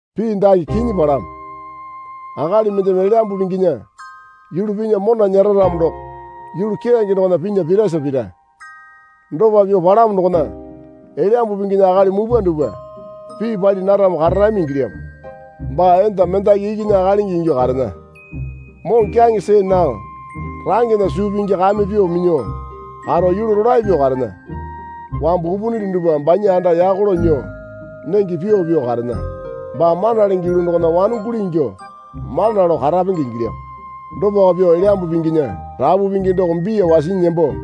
Pii dake kinyi palamo. Akali mendeme Elyambu Pinginya yulu pinya mona nyera ramo doko yulu keyange dokona pinya pirasa pira. Dopa pyuo palamo dokona Elyambu Pinginya akali mupwa dupwa pii pali naramo kararami ingilyamo. Baa enda mendaki ikinya akalingi ingyuo karena. Moŋokyaŋe see nao rangena suu pingi kame pyuo minyuo karo yulu rolae pyuo karena. Wambu upunili dupwa banya anda yako lao nyuo nenge pyuo pyuo karena. Baa mana lenge yulu dokona wanonguli ingyuo mana lao karapenge ingilyamo. Dopako pyuo Elyambu Pinginya rapu pingi doko biya wasinyi nembo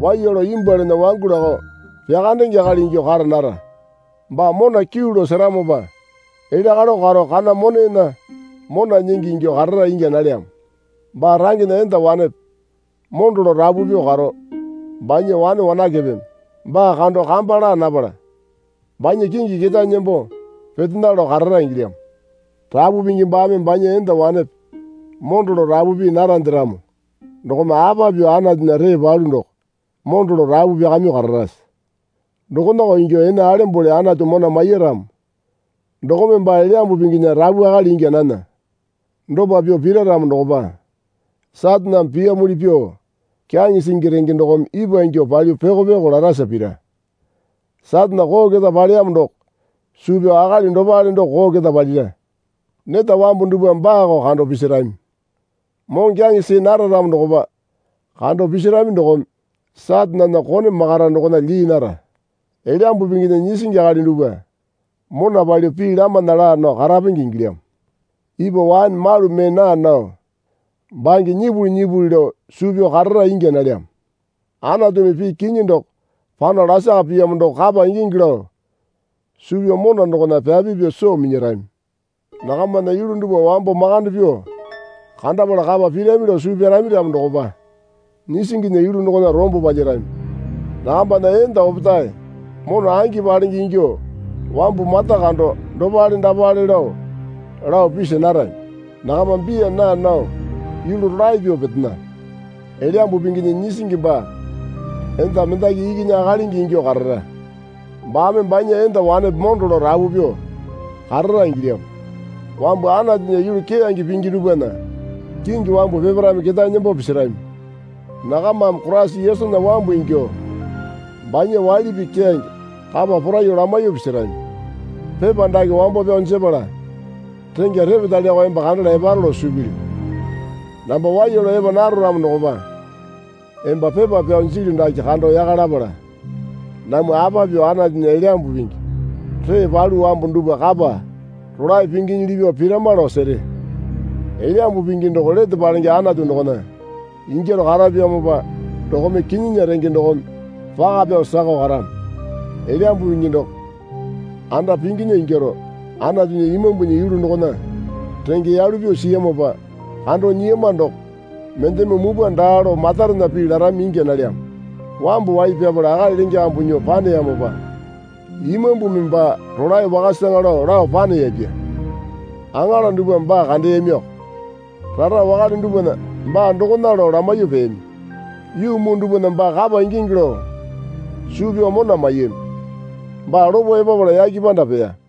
waiya lao imbwualana wangu lakao pyakandenge akali ingyuo kara nara. Baa mona kyuu lao seramopa elya kalo karo kana monena mona nyingi ingyuo karara ingya nalyamo. Baa rangena enda wanepe mondo lao rapu pyuo karo banya wane wanakepeme baa kando kamba laa napala banya kingi ketae nembo petena lao karara ingilyamo. Rapu pingi baame banya enda wanepe mondo lao rapu pii narande ramo dokome apa pyuo Anatunya ree palu doko mondo lao rapu pyakamyuo kararase? Dokonako ingyuo ene alembole Anatu mona maiya ramo dokome baa Elyambu Pinginya rapu akali ingya nana. Dopa pyuo pira ramo dokopa Sataneme piyamuli pyuo kyaŋe singi renge dokome ipwa ingyuo palyuo pyoko pyoko larasa pira. Satane koo keta paleyamo doko suu pyao akali dopale doko koo keta palira. Neta wambu dupwame baako kando pisirami. Moŋokyaŋe see nara ramo dokopa kando pisarami dokome Satanena kone makara dokona lyii nara. Elyambu Pinginya nyisingi akali dupwa mona palyuo pii lamana laa nao karapenge ingilyamo. Ipwa waene malu mee naa nao bange nyipuli nyipuli lao suu pyao karara ingya nalyamo. Anatumi pii kinyi doko pano lasaka piyamo doko kapa ingingi lao suu pyao mona dokona pyapi pyuo soo minyarami. Nakamana yulu dupwa wambo makande pyuo kandapala kapa pirami lao suu pyarami ramo dokopa nyisinginya yulu dokona rombo palyarami. Nakambana enda opetae mona angi palenge ingyuo wambu mata kando dopale dapale, lao lao pisa narami. Nakama biya naa nao yulu rolae pyuo petena. Elyambu Pinginya nyisingi baa enda mendaki ikinya akalingi ingyuo karara. Baame banya enda wanepe mondo lao rapu pyuo karara ingilyamo. Wambu Anatunya yulu keyange pingi dupwana kingi wambu peparaeme ketae nembo pisirami. Nakamame Koraisa Yesunya wambu ingyuo banya waili pii keyange kapa poraiyuo lamaiyuo pisirami. Pepa dake wambo pyao jepala rengya repetaleko emba kandala eparo lao suu pilyu. Namba waiya lao epa naro ramo dokopa emba pepa pyao jilyu dake kando yaka lapala namwa apa pyuo Anatunya Elyambu Pingi ree palu wambu dupwa kapa rolae pinginyili pyuo pirama lao sere. Elyambu Pingi doko lete palenge Anatu dokona ingyaro karapyamopa dokome kinyinya renge dokome paka pyao sakao karamo. Elyambu Pingi doko anda pinginya ingyaro Anatunya Imambunya yulu dokona renge yalu pyuo siyamopa kando nyiyama doko mendeme mupwa daa lao matarena pii larami ingya nalyamo. Wambu wai pyapala akali lenge kambu nyuo paneyamopa, Imambumi baa rolae wakasaŋa lao lao paneyapya. Aŋala dupwame baa kandeyamiko. Rara wakale dupwana baa dokona lao lamaiyuo peyami. Yuu muu dupwana baa kapa ingingi lao suu pyao mona maiyami. Baa lopo epapala yake panda peya.